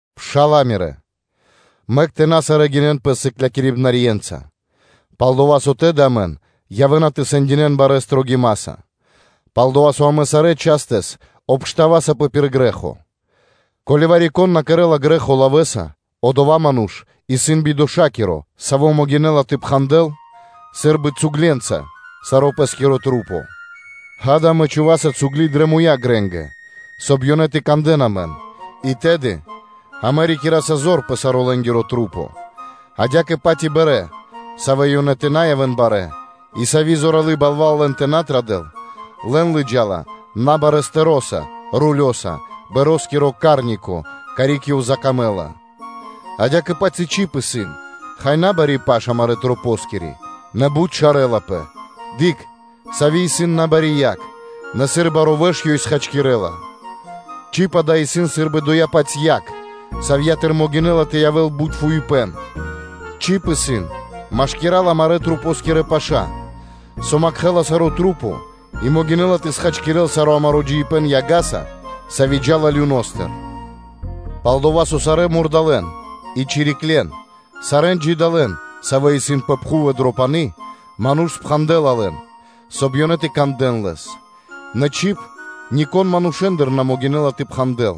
Пшала́лэ мирэ́! Мэк тумэ́ тэ на сарэ́ гинэн пэс сыклякирибнаскирэнца, пал-дова́ со тэды амэн явэ́на тэ сэндинэ́н барэ́ строгимаса. Пал-дова́ со амэ сарэ́ частэс обштавасапэ пир грэ́хо. Ко́ли вари-кон на кэрэ́ла грэ́хо лавэ́са, одова́ ману́ш исын бидошакиро, саво́ могинэ́ла тэ пхандэл сы́рбы цугленца сарэ́ пэ́скирэ маса́. Ѓа́да, амэ чхуваса цугли (удилы) дрэ муя́ грэнгэ, соб (кай) ёнэ тэ кандэ́н амэн, и тэды амэ рикираса зор пэ сарэ́ лэ́нгирэ маса́. Адя́кэ-паць и па́рмы (корабли), савэ́ ёнэ тэ на явэ́н барэ́ и сави́ зоралы́ балва́л лэн тэ на традэл, лэн лыджа́ла набарэ́ рулёса (стэроса) пармакиро стэритко (рулитко), карик ёв закамэ́ла. Адя́кэ-паць и чиб исын, хай, набари паш амарэ́ масэнгири, нэ бут шарэлапэ. Дыкх, сави́ исын набари яг, нэ сыр баро́ вэш ёй хачкирэ́ла. Чиб-дава́ исын сы́рбы доя́-паць яг, савья́тыр могинэ́ла тэ явэ́л бут фуипэ́н; чиб исын машкира́л амарэ́ масэнгирэ паша́, со калякирэла саро́ и могинэ́ла тэ схачкирэл саро́ амаро́ джиибэ́н яга́са, сави́ джа́ла люностыр (адостыр). Пал-дова́ со сарэ́н мурдалэ́н и чириклен, сарэ́н джидалэн, савэ́ исын пэ пхув и дро пани́, ману́ш лэ́ла зор пэ лэ́ндэ, соб (кай) ёнэ тэ кандэ́н лэс. Нэ чиб нико́н манушэ́ндыр на могинэ́ла тэ пхандэл;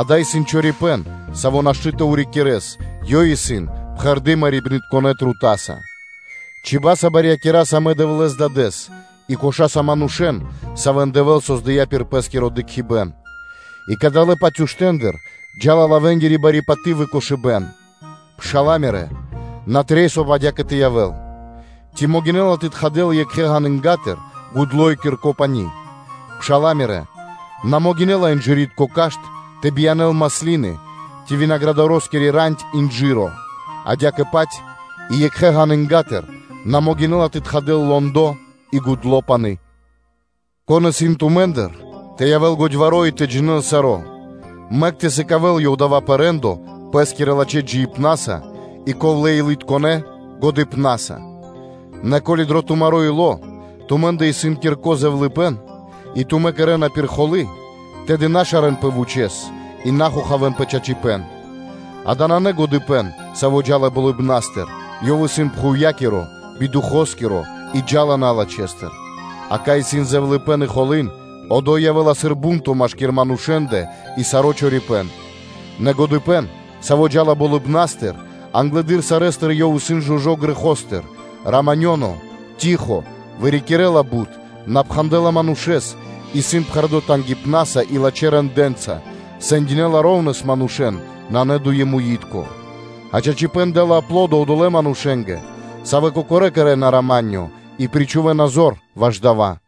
дава́ исын чорипэ́н, саво́ нашты́ тэ урикирэс, ёй исын пхэрды́ мэрибнытконэ трутаса (ядоса). Чибаса (чибьяса) барьякираса амэ Дэвлэ́с-Дадэ́с, и кошаса манушэ́н, савэ́н Дэвэ́л создыя́ пир Пэ́скиро дыкхибэ́н. И кадалэ́-паць уштэндыр джа́ла лавэнгири бари паты́в и кошыбэ́н. Пшала́лэ мирэ́, на трэй, соб (кай) адя́кэ тэ явэ́л. Ци могинэ́ла тэ тхадэл екхэ ґанынгатыр гудло́ и кирко пани́. Пшала́лэ мирэ́, на могинэ́ла инжыритко кашт тэ биянэ́л маслины, ци винаградоскири рандь инжыро? Адя́кэ-паць и екхэ ґанынгатыр на могинэ́ла тэ тхадэл лондо и гудло́ пани́. Кон исын тумэ́ндыр тэ явэ́л годьваро́ и тэ джинэ́л саро́; мэк ёв тэ сыкавэ́л дава́ пэ рэ́ндо пэ́скирэ лачхэ́ джиибнаса и ковлэ́-илытконэ годыпнаса; нэ ко́ли дро тумаро́ ило́ тумэ́ндэ исын кирко зэвлыныпэ́н и тумэ́ кэрэ́на пир холы́, тэды на шарэнпэ вучэ́с и на хохавэн пэ чачипэ́н. Дава́ нанэ годыпэ́н, саво́ джа́ла болыбна́стыр, ёв исын пхувья́киро, бидухоскиро и джа́ла налачхэстыр. А кай исын зэвлэныпэн и холы́, одо́й явэ́ла сыр бу́нто машки́р манушэ́ндэ и саро́ чорипэ́н. Нэ годыпэ́н, саво́ джа́ла болыбна́стыр, англэды́р сарэ́стыр ёв исын жужо́ грэхостыр, раманёно, штыл (тихо), вырикирэ́ла бут, на пхандэла манушэ́с, исын пхэрдо́ тангипнаса и лачхэ́ рэндэ́нца, сэндинэла шэра́ (ра́внэс) манушэ́н, нанэ дуемитко. А чачипэ́н дэ́ла аплодо одолэ́ манушэ́нгэ, савэ́ кокорэ́ кэрэ́на рама́нё (миро) и причхувэна зор ваш дава́.